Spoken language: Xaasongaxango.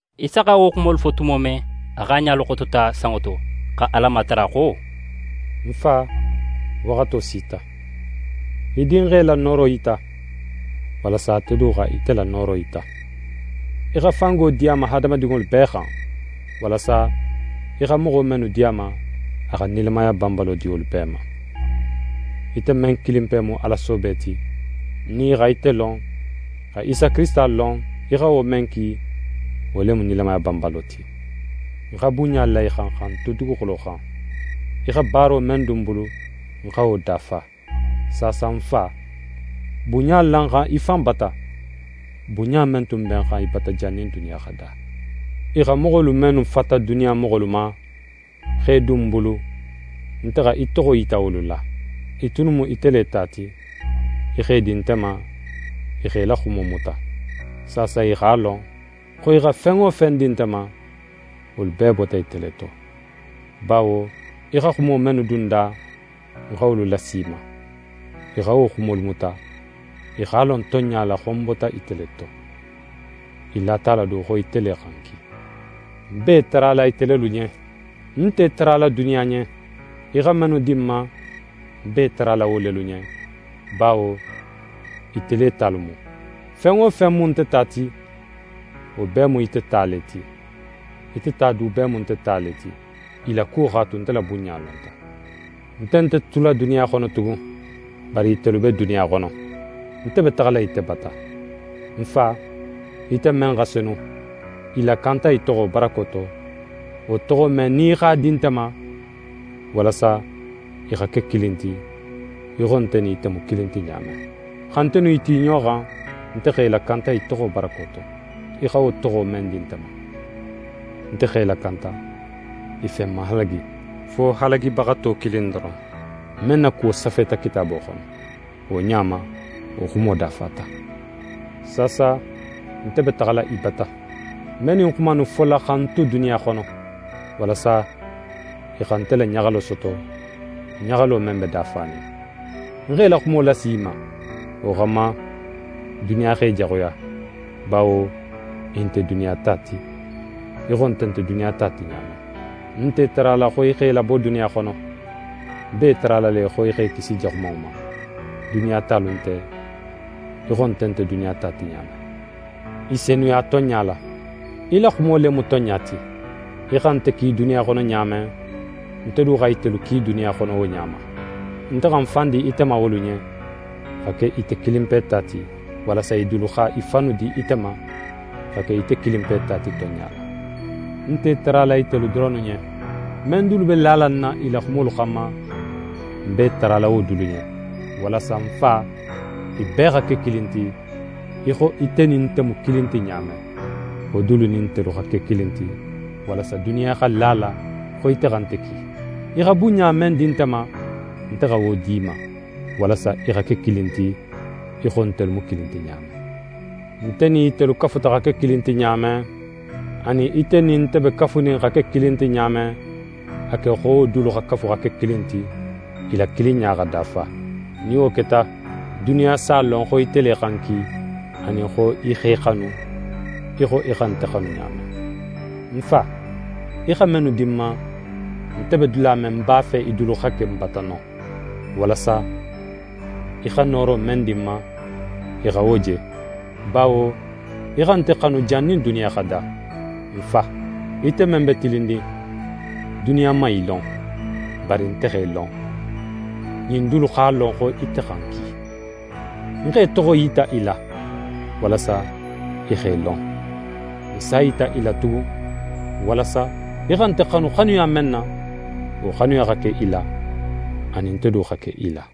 Isa xa wo xumolu fo tumo men, a x'a ɲalu xotota sanŋo to, xa Ala matara xo: «Ń Fa, waxato sita. Í Dinxe la nooro yita, walasa ate du xa ite la nooro yita. Í xa fango di a ma hadamadinŋolu bee xan, walasa í xa moxo mennu di a ma, a xa nilamaya banbalo di wolu bee ma. Ite men kilinpe mu Ala soobe ti, nin i xa ite lon, xa Isa Kirisita lon, í xa wo men ki, wo le mu nilamaya banbalo ti. Ń xa bunɲa la í xan xa ń tu duguxulo xan; í xa baaro men dun ń bulu, ń xa wo dafa. Saasa, ń Fa, bunɲa la ń xan í fan bata, bunɲa men tun be ń xan í bata jannin duniya xa da. «I xa moxolu mennu fata duniya moxolu ma, x'e dun ń bulu, nte xa í toxo yita wolu la. I tunnu mu ite le ta ti, í x'e di nte ma, i x'é la xumo muta. Saasa i x'a lon, xo í xa fen wo fen di nte ma, wolu bee bota ite le to. Bawo í xa xumo mennu dun ń da, ń xa wolu lasi i ma. I xa wo xumolu muta. I x'a lon tonɲa la, xo ń bota ite le to. I lata a la du xo ite le xa ń ki. «Ń b'é tarala ite lelu ɲen. Ń nt'é tarala duniya ɲen. Í xa mennu di ń ma, ń b'é tarala wo lelu ɲen; bawo ite le talu mu. Fen wo fen mu nte ta ti, wo bee mu ite ta le ti. Ite ta du bee mu nte ta le ti. I la kuwo x'a tu, nte la bunɲa lonta. Nte nte tula duniya xono tugun, bari itelu be duniya xono; nte be taxala ite bata. Ń Fa, ite men xa senu, i lakanta í toxo barako to, wo toxo men, nin í x'a di nte ma; walasa i xa ke kilin ti, í xo nte nin ite mu kilin ti ɲa men. Xa nte nin i tu i ɲoxo xan, nte x'e lakanta í toxo barako to, í xa wo toxo men di nte ma. Nte x'e lakanta, i fen man halagi, fo halagibaxato kilin doron, men na kuwo safeta Kitaabo xono. Wo ɲa ma, wo xumo dafata. Saasa nte be taxala í bata. Ń be ɲin xuma innu fola xa ń tu duniya xono, walasa i xa nte la ɲaxalo soto, ɲaxalo men be dafanin. Ń x'é la xumo lasi i ma. Wo xanma, duniya x'e jaxuya, bawo i nte duniya ta ti, í xo nte nte duniya ta ti ɲa men. Ń nt'é tarala xo í x'e labo duniya xono. Ń b'é tarala le xo í x'e kisi Jaxumanŋo ma. Duniya talu nte, í xo nte nte duniya ta ti ɲa men. I senuya tonɲa la. Í la xumo le mu tonɲa ti. Í xa nte ki duniya xono ɲa men, nte du xa itelu ki duniya xono wo ɲa ma. Nte xa ń fan di ite ma wolu ɲen, xa ke ite kilinpe ta ti, walasa i dulu xa i fannu di ite ma xa ke ite kilinpe ta ti, tonɲa la. «Ń nte í tarala itelu doronnu ɲen. Men dulu be nala lala ń na i la xumolu xanma, ń b'é tarala wo dulu ɲen; walasa, ń Fa, i bee xa ke kilin ti, í xo nte nin ite mu kilin ti ɲa men, wolu dulu nin ntelu xa ke kilin ti, walasa duniya xa la a la, xo ite xa nte ki. Í xa bunɲa men di nte ma, nte xa wo d'i ma, walasa i xa ke kilin ti, í xo ntelu mu kilin ti ɲa men. Nte nin itelu kafuta xa ke kilin ti ɲa men, anin ite nin nte be kafunin xa ke kilin ti ɲa men, a ke xo wo dulu xa kafu xa ke kilin ti, i la kilinɲa xa dafa. Nin wo keta, duniya s'a lon xo ite le xa ń ki, anin xo í x'e xanu, í xo í xa nte xanu ɲa men. «Ń Fa, í xa mennu di ń ma, nte be dula men, ń b'a fe i dulu xa ke ń bata non, walasa í xa nooro men di ń ma, i xa wo je; bawo í xa nte xanu jannin duniya xa da. Ń Fa, ite men be tilinnin, duniya man í lon, bari nte x'é lon, ɲin dulu x'a lon, xo ite xa ń ki. Ń x'é toxo yita i la, walasa i x'é lon. Ń s'a yita i la tugun, walasa í xa nte xanu xanuya men na, wo xanuya xa ke i la, anin nte du xa ke i la.»